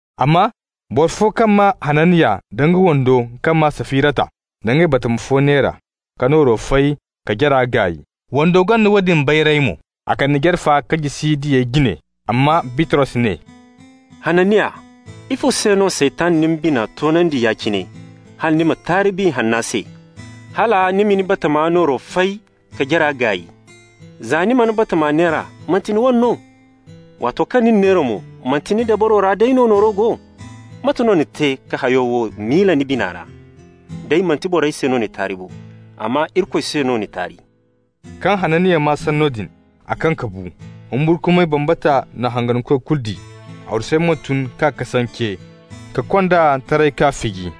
Amma boro fo kaŋ maa Hananiya da nga wando kaŋ maa Safirata na nga batama fo neera ka nooro fay ka jara gaay. Wando gonda woodin bayray mo. A kande jare fa k'a jisi diyey jine. Amma Bitros ne: «Hananiya, ifo se no Saytan na ni bina toonandi ya-cine hala ni ma taari Biya Hanna se, hala ni ma ni batama nooro fay ka jara gaay? Za ni mana batama neera, manti ni wane no? Waato kaŋ ni n'a neera mo, manti ni dabaro ra day no nooro go? Mate no ni te ka hayo wo miila ni bina ra? Day manti borey se no ni taari bo, amma Irikoy se no ni taari.» Kaŋ Hananiya maa sanno din, a kaŋ ka bu. Humburkumay bambata na hangankoy kulu di. Arwasey mo tun k'a kasance, ka kond'a taray k'a fiji.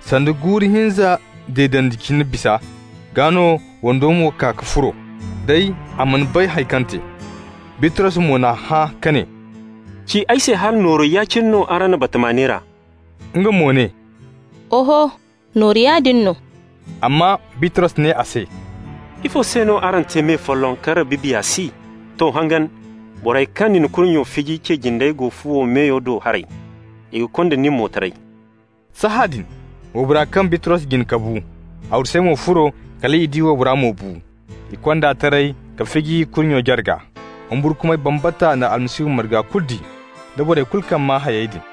Sanda guuru hinza deedandi cine bisa, gaa no wando mo kaa ka furo. Day a mana bay haŋ kaŋ te. Bitros mo n'a hã ka ne: «Ci ay se hala nooru ya-cine no araŋ na batama neera?» Nga mo ne: «Oho, nooru yaadin no.» Amma Bitros ne a se: «Ifo se no araŋ te me folloŋ ka Rabbi Biya si? To, hangan! Borey kaŋ na ni kurnyo fiji cey jinde go fuwo meyo do haray, i ga konda nin mo taray.» Sahãadin waybora kaŋ Bitros jine ka bu. Arwasey mo furo, kal i di waybora mo bu. I kond'a taray k'a fiji kurnyo jarga. Humburkumay bambata na Almasihu marga kulu di, da borey kulu kaŋ maa hayey din.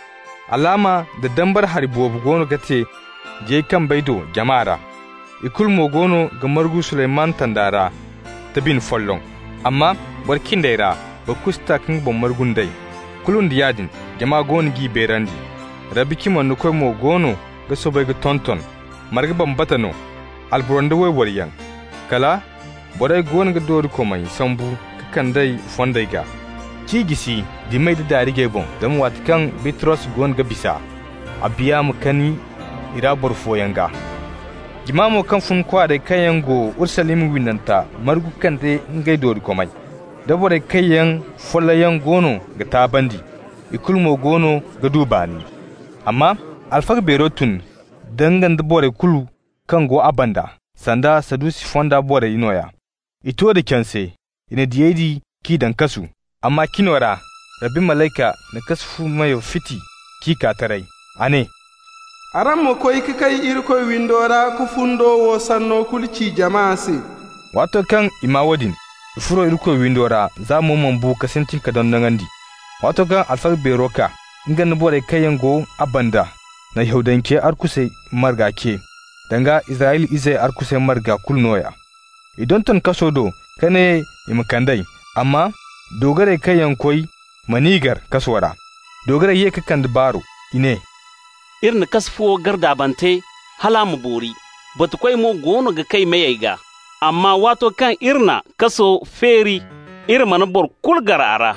Alaama nda dambara hari boobo goono ga te diyey kambey do jama ra. I kulu mo goono ga margu Suleymanu tanda ra da bine folloŋ. Amma boro cindey ra, boro kulu si ta ka nga boŋ margu nd'ey. Kulu nda yaadin jama goono g'i beerandi. Rabbi cimandikoy mo goono ga soobay ka tonton, marga bambata no, alboro nda wayboro yaŋ. Kala borey goono ga doorikomey sambu ka kand'ey fondey gaa, k'i jisi dimey da daarijey boŋ, zama waati kaŋ Bitros goono ga bisa, a biya ma kani i ra boro fooyaŋ gaa. Jama mo kaŋ fun kwaarey kaŋ yaŋ go Urusalima windanta margu ka kande ngey doorikomey, da borey kaŋ yaŋ follayyaŋ goono ga taabandi. Ikulu mo goono ga du baani. Amma alfaga beero tun, nga nda borey kulu kaŋ go a banda, (sanda Sadusi fonda borey nooya). I to da canse. I na diyey di k'i daŋ kasu. Amma cino ra Rabbi malayka na kasu fu meyo fiti k'i kaa taray. A ne: «Araŋ ma koy ka kay Irikoy windo ra ka fundo wo sanno kulu ci jama se.» Waato kaŋ i maa woodin, i furo Irikoy windo ra za mo bo ka sintin ka dondonandi. Waato kaŋ alfaga beero kaa, nga nda borey kaŋ yaŋ go a banda na Yahudancey arkusey marga ce, danga Israyla izey arkusey marga kulu nooya. I donton kaso do ka ne i ma kand'ey. Amma doogarey kaŋ koy man'i gar kaso ra. Doogarey ye ka kande baaro. I ne: «Iri na kasu fuwo gar daabante hal a ma boori, batukoy mo goono ga kay meyey gaa. Amma waato kaŋ iri na kaso feeri, iri mana boro kulu gar a ra.»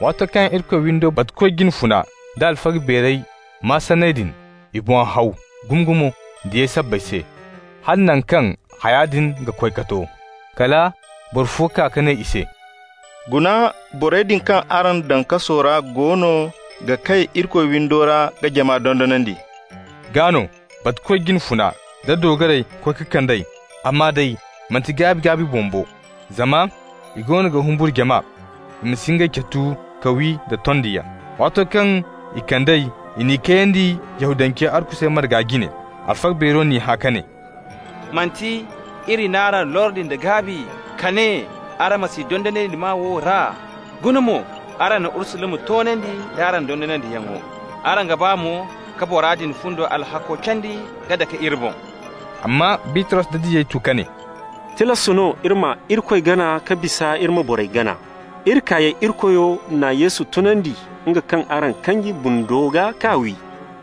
Waato kaŋ Irikoy windo batukoy jine funa da alfaga beerey maa sanney din, i boŋ haw gumo diyey sabbay se, hala naŋ kaŋ haya din ga koy ka to. Kala boro fo kaa ka ne i se: «Guna, borey din kaŋ araŋ daŋ kaso ra goono ga kay Irikoy windo ra ka jama dondonandi.» Gaa no batukoy jine funa da doogarey koy ka kand'ey, amma day manti gaabi-gaabi boŋ bo, zama i go ga humburu jama, i ma si ngey catu ka wi da tondiyaŋ. Waato kaŋ i kand'ey, i n'i kayandi Yahudancey arkusey marga jine. Alfaga beero n'i hã ka ne: «Manti iri n'araŋ lordi nda gaabi ka ne araŋ ma si dondonandi maa wo ra? Guna mo, araŋ na Urusalima toonandi nd'araŋ dondonandiyaŋo. Araŋ ga ba mo ka bora din fundi alhakko candi k'a dake iri boŋ.» Amma Bitros da diyey tu ka ne: «Tilas no iri ma Irikoy gana ka bisa iri ma borey gana. Iri kaayey Irikoyo na Yesu tunandi, nga kaŋ araŋ kanji bundo gaa k'a wi.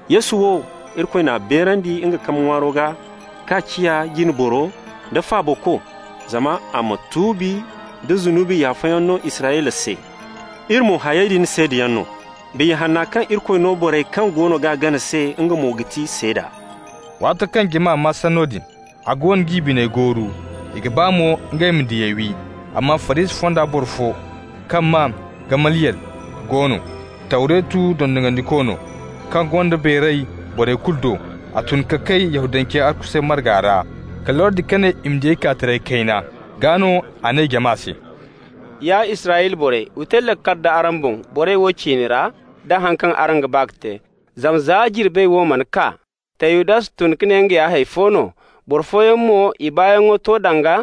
Yesu wo, Irikoy n'a beerandi nga kambe ŋwaaro gaa k'a ciya Jine Boro da Faabako, zama a ma tuubi nda zunubi yaafayaŋ no Israyla se. Iri mo hayey din seedayaŋ no. Biya Hanna kaŋ Irikoy no borey kaŋ goono g'a gana se, nga mo ga ti seeda.» Waato kaŋ jama maa sanno din, a goono g'i biney gooru, i ga ba mo ngey ma diyey wi. Amma Farisi fonda boro fo kaŋ maa Gamaliyel go no, Tawretu dondonandiko no, kaŋ gonda beeray borey kulu do. A tun ka kay Yahudancey arkusey marga ra, ka lordi ka ne i ma diyey kaa taray kayna. Gaa no a ne jama se: «Ya Israyla borey, wa te laakal d'araŋ boŋ borey din ciine ra, da haŋ kaŋ araŋ ga ba ka te. Zama za jirbey wo mana kaa, Teyudas tun ka ne nga ya hay fo no. Boro fooyaŋ mo, i baayaŋ ga to danga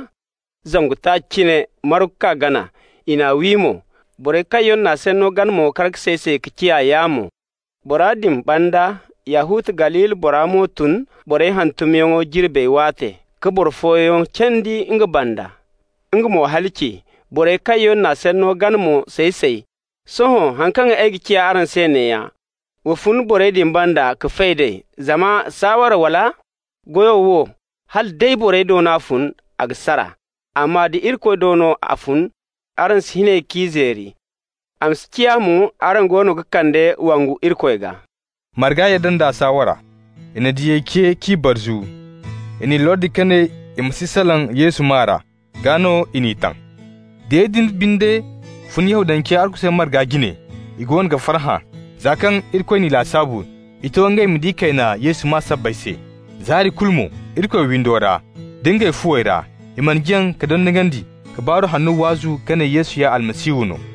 zangu taaci cine, margu k'a gana. I n'a wi mo. Borey kaŋ yaŋ n'a sanno gana mo kar ka say-say ka ciya yaamo. Bora din banda Yahuta, Galili bora mo tun borey hantumyaŋo jirbey waate ka boro fooyaŋ candi nga banda. Nga mo halaci. Borey kaŋ yaŋ n'a sanno gana mo say-say. Sohõ haŋ kaŋ ay ga ci araŋ se neeya: wa fun borey din banda ka fay d'ey. Zama saawara wala goyo wo, hala day borey do no a fun, a ga sara. Amma da Irikoy do no a fun, araŋ si hin ey k'i zeeri. A ma si ciya mo araŋ goono ga kande wongu Irikoy gaa.» Marga yadda nd'a saawara. I na diyey ce k'i barzu. I n'i lordi ka ne i ma si salaŋ Yesu maa ra. Gaa no i n'i taŋ. Diyey binde fun Yahudancey arkusey marga jine. I goono ga farhã, za kaŋ Irikoy n'i lasaabu i to ngey ma di kayna Yesu maa sabbay se. Zaari kulu mo Irikoy windo ra da ngey fuwey ra, i mana jaŋ ka dondonandi ka baaro hanno waazu ka ne Yesu ya Almasihu no.